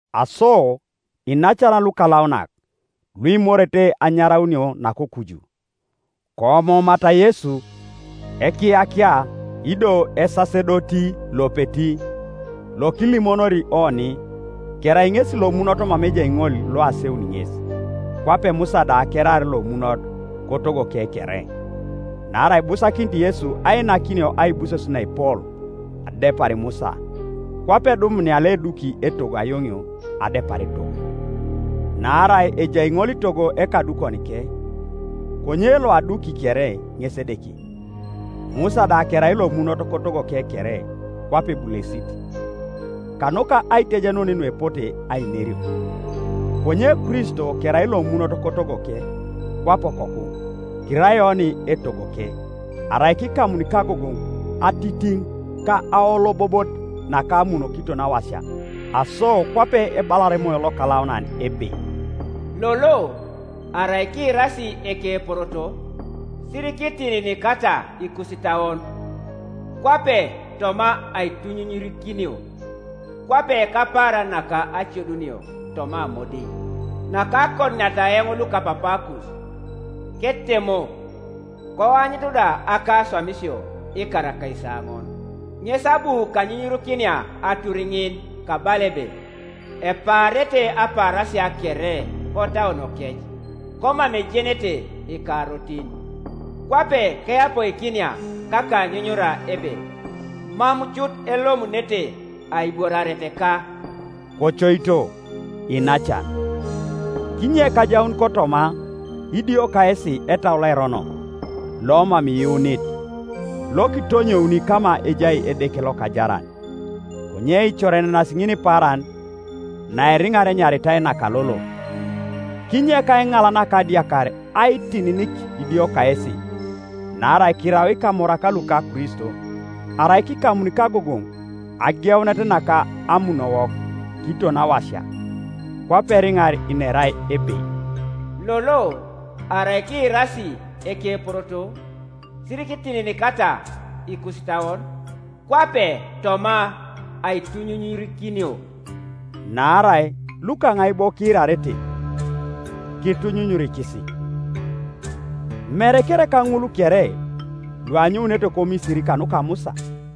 Aso, iinacan lukalaunak, luimorete anyaraunio nakokuju, koomoomata Yesu, Ekiyakia ido Esasedoti lopeti lokilimonori oni. Kerai ŋesi lomunot mama ejai ŋol loaseuni ŋes, kwape Musa da keraar lomunot kotogoke kere. Naarai ibusakinit Yesu ainakinio aibuses naepol adepar Musa, kwape edumunia loeduki etogo ayoŋio adepar etogo. Naarai ejai ŋolitogo ekadukonike, konye loaduki kere ŋes Edeke. Musa da kerai lomunot kotogoke kere kwape ebulesit, kanuka aitejenun nuepote ainerio, konye Kristo kerai lomunot kotogoke kwape okoku. Kirai oni etogoke, arai kikamuni kagogoŋ ati tiŋ ka aolobobot naka amun kiton awasia. Aso kwape ebalar Emoyo Lokalaunan ebe, “Lolo, arai kiirasi ekeporoto. Sirikitininikata ikusitauon, kwape toma aitunyunyurikinio, Kwape kapaaran naka acodunio toma amodiŋ. Nakakoduniata eoŋ lukapapaakus, ketemo, Koanyutu da akaswamisio ikar akaisaoŋon. Ŋes abu kanyunyurikinia atur ŋin, Kabala ebe, ‘Epaarete apaarasia kere kotauonokec; Komam ejenete ikarotin,’ Kwape keyapoikinia kakanyunyura ebe, ‘Mam cut elomunete aibworareteka.’” Kocoito, iinacan, kinyek ajaun kotoma idio kayesi etau loerono lomam iyuunit, lokitonyouni kama ejai Edeke lokajaran. Konye kicorenenas ŋinipaaran, naeriŋar enyaritai “naka lolo”, kinyek aiŋal naka adiakar aitininik idio kayesi. Naarai kirau ikamorak luka Kristo, arai kikamuni kagogoŋ ageunet naka amunowok kiton awasia. Kwape eriŋar inerai ebe, “Lolo, arai kiirasi ekeporoto, Sirikitininikata ikusitauon, kwape toma aitunyunyurikinio.” Naarai lukaŋai bo kiirarete, kitunyunyurikisi? Mere kereka ŋul kere luanyounete koMisiri kanuka Musa?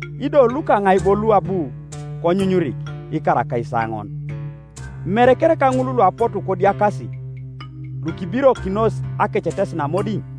Ido lukaŋai bo luabu konyunyurik ikar akaisaoŋon? Mere kereka ŋul luapotu kodiakas, lukibirokinos akecetesin amodiŋ?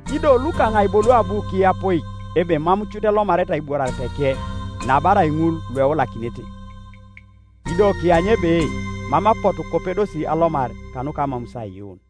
Ido lukaŋai bo luabu kiyapoik ebe mam cut elomarete aibworareteke, nabarai ŋul lueulakinete? Ido kianyu ebe mam apotu kopedosi alomar kanuka amamus aiyuun.